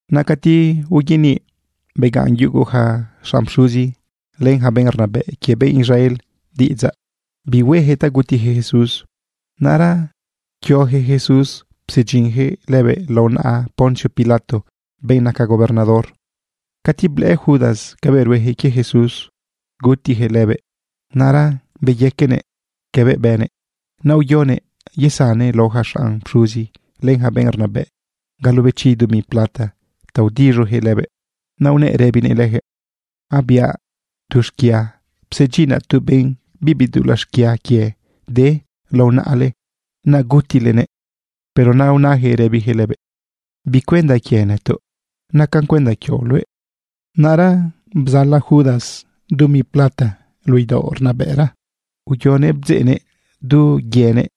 Naꞌ cati uyaniꞌ naꞌ, begaꞌn yugu ja xanꞌ pxuzi, len ja benꞌ rnabëꞌ quie benꞌ Israel diꞌidzaꞌ bi huejëꞌ ta gutijëꞌ Jesús. Naꞌra nuquiojëꞌ Jesús psedyinjëꞌ lëbëꞌ lao naꞌa Poncio Pilato, benꞌ naca gobernador. Cati blëꞌë Judas cabëꞌ ruejëꞌ quie Jesús gutijëꞌ lëbëꞌ, naꞌra beyaquenëꞌ cabëꞌ bënëꞌ. Naꞌ uyonëꞌ yesannëꞌ lao ja xanꞌ pxuzi, len ja benꞌ rnabëꞌ galobechi dumi plata ta udiz̃ujëꞌ lëbëꞌ. Naꞌ unëꞌ rëbinëꞌ lëjëꞌ: ―Abiaꞌ tu xquia, psedyinaꞌ tu benꞌ bibi dulaꞌ xquia quie de lao naꞌale, naꞌ gutilenëꞌ. Pero naꞌ unajëꞌ rëbijëꞌ lëbëꞌ: ―¿Bi cuenda quie nëtoꞌ? Nacan cuenda quioꞌ luëꞌ. Naꞌra bzala Judas dumi plata luꞌu idaoꞌ rnabëꞌra uyoguëꞌ bdzeꞌnëꞌ du quienëꞌ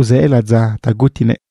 uzë ladza ta gutinëꞌ.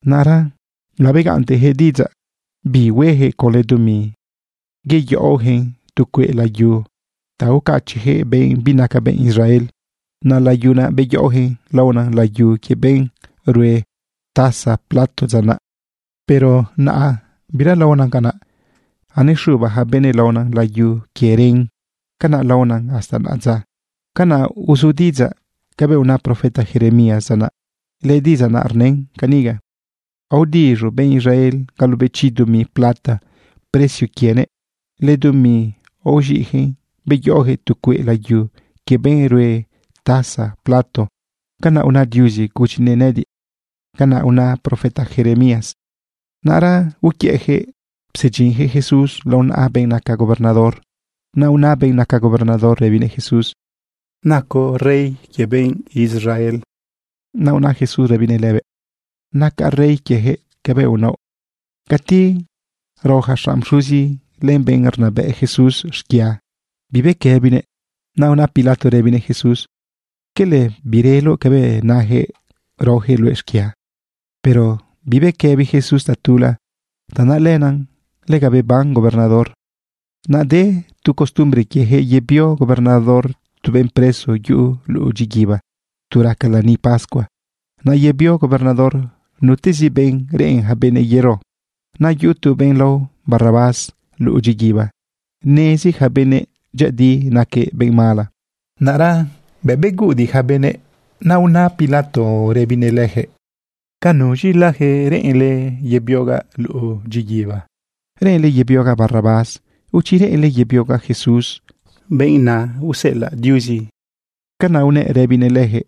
Naꞌra labegaꞌntejëꞌ diꞌidzaꞌ bi huejëꞌ conlë dumi yeyaꞌojëꞌ tu cueꞌ layu ga ucachiꞌjëꞌ benꞌ binaca benꞌ Israel. Naꞌ layu beyaꞌojëꞌ laona layu quie benꞌ rue taza plato dza naꞌ. Pero naꞌa biralaona canaꞌ. Anexuba ja benëꞌ laona layu quie ren. Canaꞌ laona hasta naꞌadza. Canaꞌ uzu diꞌidzaꞌ cabëꞌ una profeta Jeremías dza naꞌ. Lëdiꞌidzaꞌ naꞌ rnën caniga: “Aodiz̃u benꞌ Israel galobechi dumi plata precio quienëꞌ. Lëdumi aoz̃iꞌjëꞌ beyaꞌojëꞌ tu cueꞌ layu quie benꞌ rue taza plato. Canaꞌ una Diuzi gudyinëꞌ nëꞌëdiꞌ.” Canaꞌ una profeta Jeremías. Naꞌra uquiëꞌjëꞌ psedyinjëꞌ Jesús lao naꞌa benꞌ naca gobernador. Naꞌ una benꞌ naca gobernador rëbinëꞌ Jesús: ―¿Nacoꞌ rey quie benꞌ Israel? Naꞌ una Jesús rëbinëꞌ lëbëꞌ: ―Nacaꞌ rey quiejëꞌ cabëꞌ unaoꞌ. Cati rao ja xanꞌ pxuzi, len benꞌ rnabëꞌ Jesús xquia, bibequëbinëꞌ. Naꞌ una Pilato rëbinëꞌ Jesús: ―¿Quele bireloꞌ cabëꞌ najëꞌ raojëꞌ luëꞌ xquia? Pero bibequëbi Jesús tatula. Tanaꞌ lenaꞌ lega beban gobernador. Naꞌ de tu costumbre quiejëꞌ yebio gobernador tu benꞌ preso yuꞌu luꞌu dyiguiba tu raca lani pascua. Naꞌ yebio gobernador nutezi benꞌ reꞌen ja benëꞌ yero. Naꞌ yuꞌu tu benꞌ lao Barrabás luꞌu dyiguiba. Nezi ja benëꞌ dyëꞌëdi naquëꞌ benꞌ mala. Naꞌra bëꞌ beguꞌudiꞌ ja benëꞌ, naꞌ una Pilato rëbinëꞌ lëjëꞌ: ―¿Ca nuz̃ilajëꞌ reꞌenle yebiogaꞌ luꞌu dyiguiba? ¿Reꞌenle yebiogaꞌ Barrabás? ¿O chi reꞌenle yebiogaꞌ Jesús, benꞌ na useꞌelaꞌ Diuzi lëbëꞌ? Canaꞌ unëꞌ rëbinëꞌ lëjëꞌ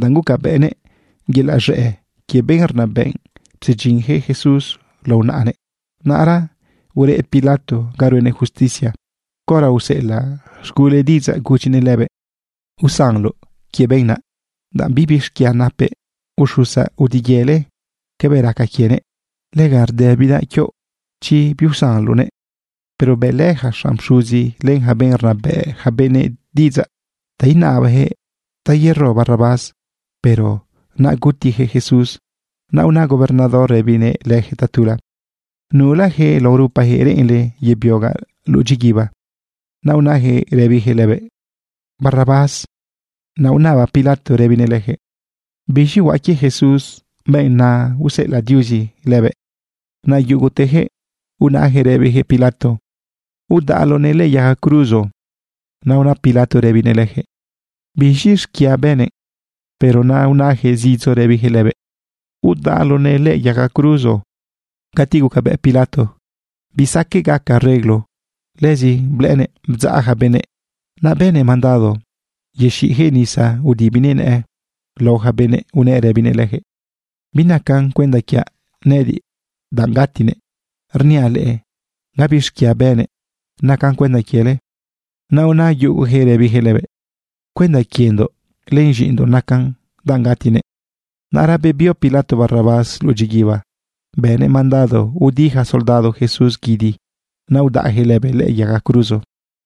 danꞌ gucabëꞌnëꞌ yelaꞌ z̃ëꞌ quie benꞌ rnabëꞌ psedyinjëꞌ Jesús lao naꞌanëꞌ. Naꞌra tu ureꞌ Pilato ga ruenëꞌ justicia, caora useꞌelaꞌ z̃gulëꞌ diꞌidzaꞌ gudyinëꞌ lëbëꞌ: “Usanloꞌ quie benꞌ naꞌ, danꞌ bibi xquia napëꞌ. Uxusaꞌ udiyele cabëꞌ raca quienëꞌ. Lega rdëbidaꞌ quioꞌ chi biusanloꞌnëꞌ.” Pero bëꞌlë ja xanꞌ pxuzi len ja benꞌ rnabëꞌ ja benëꞌ diꞌidzaꞌ ta inabajëꞌ ta yero Barrabás, pero ta gutijëꞌ Jesús. Naꞌ una gobernador rëbinëꞌ lëjëꞌ tatula: ―¿Nulajëꞌ lao rupajëꞌ reꞌenle yebiogaꞌ luꞌu dyiguiba? Naꞌ unajëꞌ rëbijëꞌ lëbëꞌ: ―Barrabás. Naꞌ unaba Pilato rëbinëꞌ lëjëꞌ: ―¿Biz̃i huaꞌ quie Jesús, benꞌ na useꞌelaꞌ Diuzi lëbëꞌ? Naꞌ yugutejëꞌ unajëꞌ rëbijëꞌ Pilato: ―¡Udaꞌloꞌnëꞌ lëꞌë yaga cruzo! Naꞌ una Pilato rëbinëꞌ lëjëꞌ: ―¿Biz̃i xquia bënëꞌ? Pero naꞌ unajëꞌ zidzo rëbijëꞌ lëbëꞌ: ―¡Udaꞌloꞌnëꞌ lëꞌë yaga cruzo! Cati gucabëꞌ Pilato bisaqueꞌ gaca areglo, lëzi blëꞌënëꞌ bdzaꞌ ja benëꞌ, naꞌ bënëꞌ mandado yexiꞌjëꞌ nisa udibinëꞌ nëꞌë lao ja benëꞌ, unëꞌ rëbinëꞌ lëjëꞌ: ―Binaca cuenda quiaꞌ nëꞌëdiꞌ danꞌ gatinëꞌ. Rniaꞌ leꞌe gabi xquia bënëꞌ. Nacan cuenda quiele. Naꞌ una yugujëꞌ rëbijëꞌ lëbëꞌ: ―Cuenda quiendoꞌ len z̃iꞌindoꞌ nacan danꞌ gatinëꞌ. Naꞌra bebio Pilato Barrabás luꞌu dyiguiba. Bënëꞌ mandado udi ja soldado Jesús guidi, naꞌ udaꞌjëꞌ lëbëꞌ lëꞌë yaga cruzo.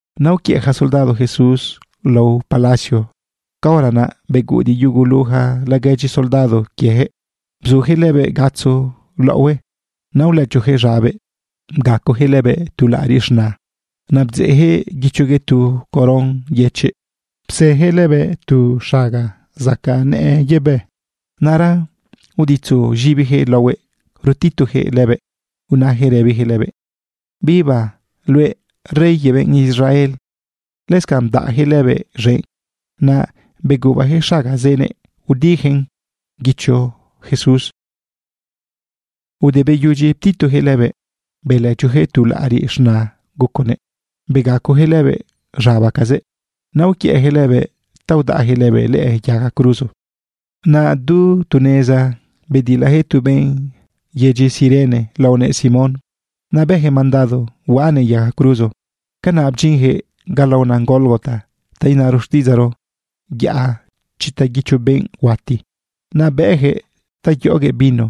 Naꞌ uquiëꞌ ja soldado Jesús lao palacio. Caora naꞌ beguꞌudiꞌ yugu ja laguedyi soldado quiejëꞌ, bzujëꞌ lëbëꞌ gatzo laꞌohue. Naꞌ ulëchojëꞌ z̃abëꞌ, bgacojëꞌ lëbëꞌ tu laꞌariꞌ z̃na. Naꞌ bdzeꞌjëꞌ guichoguëꞌ tu coron yëchiꞌ, psejëꞌ lëbëꞌ tu xaga zacaꞌ nëꞌë yebë. Naꞌra uditzujëꞌ z̃ibijëꞌ laohuëꞌ rutitujëꞌ lëbëꞌ unajëꞌ rëbijëꞌ lëbëꞌ: ―¡Viva luëꞌ, Rey quie benꞌ Israel! Lëscanꞌ bdaꞌjëꞌ lëbëꞌ z̃enꞌ. Naꞌ begubajëꞌ xaga zenëꞌ udijëꞌn guicho Jesús. Ude beyudyi ptitujëꞌ lëbëꞌ, belëchojëꞌ tu laꞌariꞌ z̃na guconëꞌ, begacojëꞌ lëbëꞌ z̃abacazëꞌ. Naꞌ uquiëꞌjëꞌ lëbëꞌ ta udaꞌjëꞌ lëbëꞌ lëꞌë yaga cruzo. Naꞌ du tu neza bedilajëꞌ tu benꞌ yedyi Cirene laonëꞌ Simón. Naꞌ bëjëꞌ mandado huaꞌanëꞌ yaga cruzo. Canaꞌ bdyinjëꞌ ga laona Gólgota, ta inaro xtiꞌidzaꞌro: Yaꞌa chita guicho benꞌ huati. Naꞌ bëꞌjëꞌ ta yoꞌoguëꞌ vino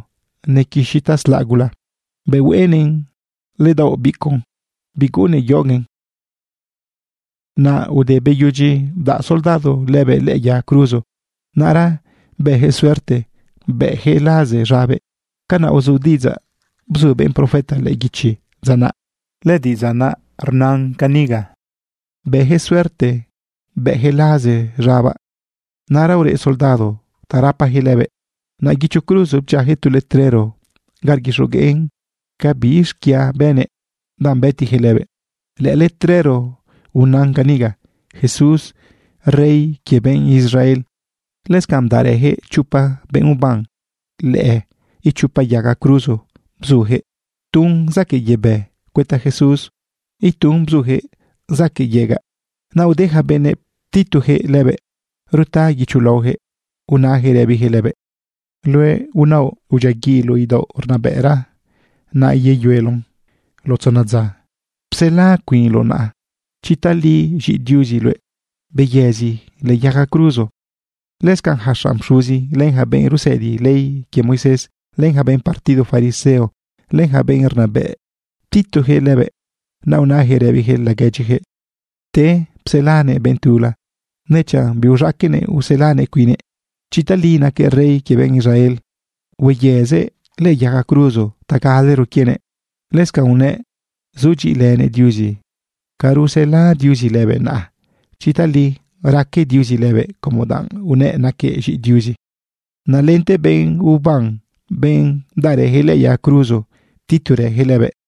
nequixi taslaꞌ gula. Bëꞌ hueꞌenëꞌn ledaoꞌ bicuꞌ, biguꞌunnëꞌ yoꞌoguëꞌn. Naꞌ ude beyudyi bdaꞌ soldado lëbëꞌ lëꞌë yaga cruzo, naꞌra bëjëꞌ suerte bëꞌjëꞌ laze z̃abëꞌ. Canaꞌ uzu diꞌidzaꞌ bzu benꞌ profeta lëꞌë guichi dza naꞌ. Lëdiꞌidzaꞌ rnan caniga: “Bëjëꞌ suerte bëꞌjëꞌ laze z̃abaꞌ.” Naꞌra ureꞌ soldado ta rapajëꞌ lëbëꞌ. Naꞌ guicho cruzo bdyiajëꞌ tu letrero ga rguixogueꞌn ca bi xquia bënëꞌ danꞌ bëtijëꞌ lëbëꞌ. Lëꞌë letrero unan caniga: “Jesús, Rey quie benꞌ Israel.” Lëscanꞌ bdaꞌrëjëꞌ chopa benꞌ uban lëꞌë ichopa yaga cruzo. Bzujëꞌ tun zaquëꞌ yebë cuëta Jesús, itun bzujëꞌ zaquëꞌ yegaꞌ. Naꞌ ude ja benëꞌ ptitujëꞌ lëbëꞌ ruta guicho laojëꞌ. Unajëꞌ rëbijëꞌ lëbëꞌ: ―Luëꞌ unaoꞌ udyiaguiꞌloꞌ idaoꞌ rnabëꞌra, naꞌ yeyueloꞌn lao tzona dza, psela cuinloꞌ naꞌa. Chi tali z̃iꞌi Diuzi luëꞌ, beyëzi lëꞌë yaga cruzo. Lëscanꞌ ja xanꞌ pxuzi, len ja benꞌ rusëdi ley quie Moisés, len ja benꞌ partido fariseo, len ja benꞌ rnabëꞌ ptitujëꞌ lëbëꞌ. Naꞌ unajëꞌ rëbijëꞌ laguedyijëꞌ: ―Pte pselanëꞌ benꞌ tula, nechanꞌ biuz̃aqueꞌnëꞌ uselanëꞌ cuinnëꞌ. Chi tali naquëꞌ Rey quie benꞌ Israel, hueyëzëꞌ lëꞌë yaga cruzo ta galero quienëꞌ. Lëscanꞌ unëꞌ zudyiꞌilënëꞌ Diuzi. Ca rusela Diuzi lëbëꞌ naꞌa chi tali raque Diuzi lëbëꞌ como danꞌ unëꞌ naquëꞌ z̃iꞌi Diuzi. Naꞌ lente benꞌ uban, benꞌ bdaꞌrëjëꞌ lëꞌë yaga cruzo, ptiturëjëꞌ lëbëꞌ.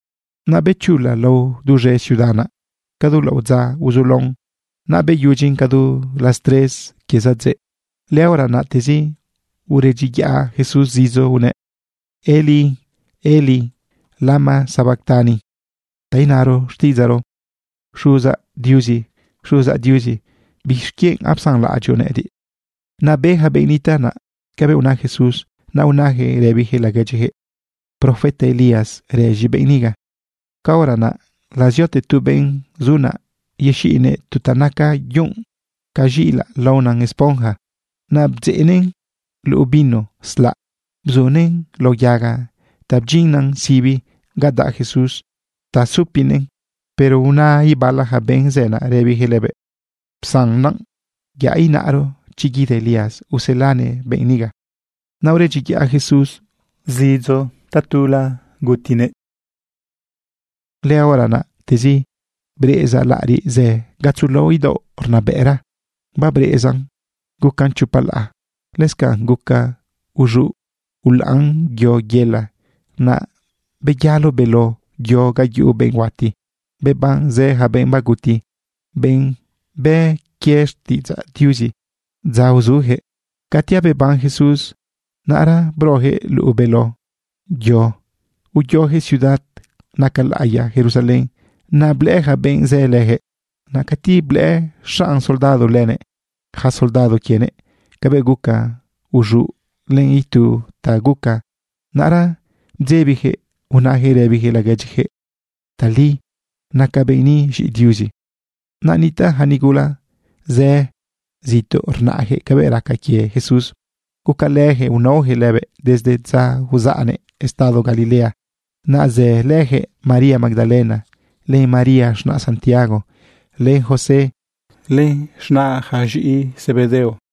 Naꞌ bechula lao duz̃e ciudad naꞌ. Cadu laꞌodza uzulaon, naꞌ beyudyin ca du las tres quie zadzëꞌ. Lëhora naꞌtezi uredyiyaꞌ Jesús zidzo unëꞌ: ―Elí, Elí, ¿lama sabactani? ―ta inaro xtiꞌidzaꞌro: Xuzaꞌ Diuzi, Xuzaꞌ Diuzi, ¿bixquienꞌ apsanlaꞌadyoꞌ nëꞌëdiꞌ? Naꞌ be ja benꞌ nitaꞌ naꞌ cabëꞌ una Jesús. Naꞌ unajëꞌ rëbijëꞌ laguedyijëꞌ: ―Profeta Elías rëz̃i benꞌ niga. Caora naꞌ laziote tu benꞌ zu naꞌ yexiꞌnëꞌ tu ta naca yunꞌ ca z̃iꞌilaꞌ laona esponja. Naꞌ bdzeꞌnëꞌn luꞌu vino slaꞌ bzunëꞌn lao yaga ta bdyinnan sibi ga daꞌ Jesús ta supinëꞌn. Pero una ibala ja benꞌ zë naꞌ rëbijëꞌ lëbëꞌ: ―Psan naꞌ. Yaꞌ inaꞌro chi guida Elías uselanëꞌ benꞌ niga. Naꞌ uredyiyaꞌ Jesús zidzo tatula, gutinëꞌ. Lëhora naꞌtezi breꞌeza laꞌariꞌ zë gatzo laoꞌ idaoꞌ rnabëꞌra. Babreꞌezan gucan chopa laꞌa. Lëscanꞌ guca uz̃uꞌ ulaꞌan yo yela. Naꞌ beyalo beló yo ga yuꞌu benꞌ huati. Beban ja zë benꞌ baguti, benꞌ bë quie xtiꞌidzaꞌ Diuzi dza uzujëꞌ. Cati abeban Jesús, naꞌra brojëꞌ luꞌu beló yo, uyojëꞌ ciudad naca laꞌiya Jerusalén. Naꞌ blëꞌë ja benꞌ zë lëjëꞌ. Naꞌ cati blëꞌë xanꞌ soldado lënëꞌ ja soldado quienëꞌ cabëꞌ guca uz̃uꞌ len itu ta guca, naꞌra bdzebijëꞌ unajëꞌ rëbijëꞌ laguedyijëꞌ: ―Tali naca benꞌ ni z̃iꞌi Diuzi. Naꞌ nitaꞌ ja nigula zë zituꞌ rnaꞌjëꞌ cabëꞌ raca quie Jesús. Gucalëjëꞌ unaojëꞌ lëbëꞌ desde dza uzaꞌnëꞌ estado Galilea. Naꞌ zëlë lëjëꞌ María Magdalena, len María z̃naꞌ Santiago, len José, len z̃naꞌ yaca z̃iꞌi Zebedeo.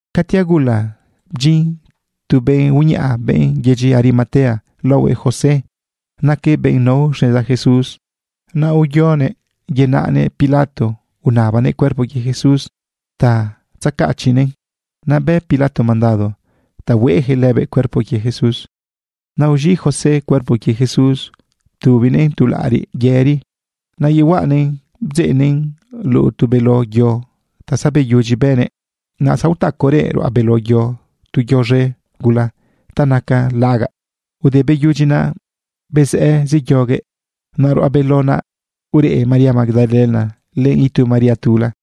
Cati agula, bdyin tu benꞌ uñaꞌa, benꞌ yedyi Arimatea laohuëꞌ José. Naquëꞌ benꞌ nao xneza Jesús. Naꞌ uyonëꞌ yenaꞌnëꞌ Pilato unabanëꞌ cuerpo quie Jesús ta tzecachiꞌnëꞌn. Naꞌ bë Pilato mandado ta hueꞌjëꞌ lëbëꞌ cuerpo quie Jesús. Naꞌ uz̃iꞌ José cuerpo quie Jesús, bdubinëꞌn tu laꞌariꞌ yëri. Naꞌ yehuaꞌanëꞌn bdzeꞌnëꞌn luꞌu tu beló yo ta zabeyudyi bënëꞌ. Naꞌ zaotacorëꞌ ruꞌa beló yo tu yo z̃e gula ta naca lagaꞌ. Ude beyudyi naꞌ, bezëꞌë zeyoguëꞌ. Naꞌ ruꞌa beló yo naꞌ ureꞌ María Magdalena lënëꞌ itu María tula.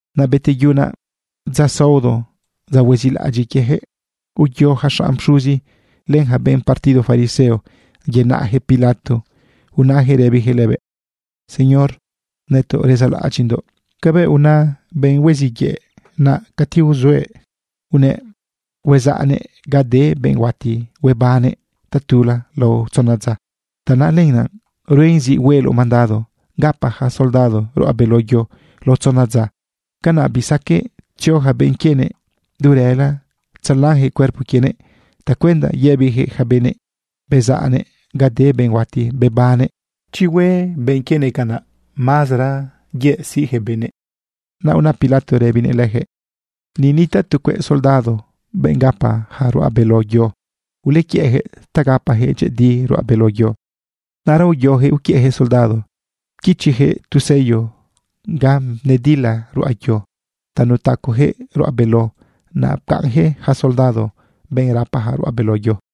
Naꞌ beteyu naꞌ dza saodo, dza huezilaꞌadyiꞌ quiejëꞌ, uyo ja xanꞌ pxuzi, len ja benꞌ partido fariseo yenaꞌjëꞌ Pilato unajëꞌ rëbijëꞌ lëbëꞌ: ―Señor, nëtoꞌ rezaꞌlaꞌadyiꞌndoꞌ cabëꞌ una benꞌ huiziꞌ yëꞌ naꞌ cati uzuëꞌ, unëꞌ huezaꞌnëꞌ ga de benꞌ huati huebannëꞌ tatula lao tzona dza. Tanaꞌ lenaꞌ ruen zi hueloꞌ mandado gapa ja soldado ruꞌa beló yo lao tzona dza. Canaꞌ bisaqueꞌ tzio ja benꞌ quienëꞌ du rëla tzelanjëꞌ cuerpo quienëꞌ tacuenda yëbijëꞌ ja benëꞌ: “Bezaꞌnëꞌ ga de benꞌ huati bebannëꞌ.” Chi huaca hue benꞌ quienëꞌ canaꞌ, mazara yëꞌ siꞌjëꞌ benëꞌ. Naꞌ una Pilato rëbinëꞌ lëjëꞌ: ―Ni nitaꞌ tu cueꞌ soldado, benꞌ gapa ja ruꞌa beló yo. Ulequiëꞌjëꞌ ta gapajëꞌ dyëꞌëdi ruꞌa beló yo. Naꞌra uyojëꞌ uquiëꞌjëꞌ soldado. Pquichijëꞌ tu sello ga nedila ruꞌa yo ta nutacojëꞌ ruꞌa beló. Naꞌ pcaꞌnjëꞌ ja soldado, benꞌ rapa ruꞌa beló yo.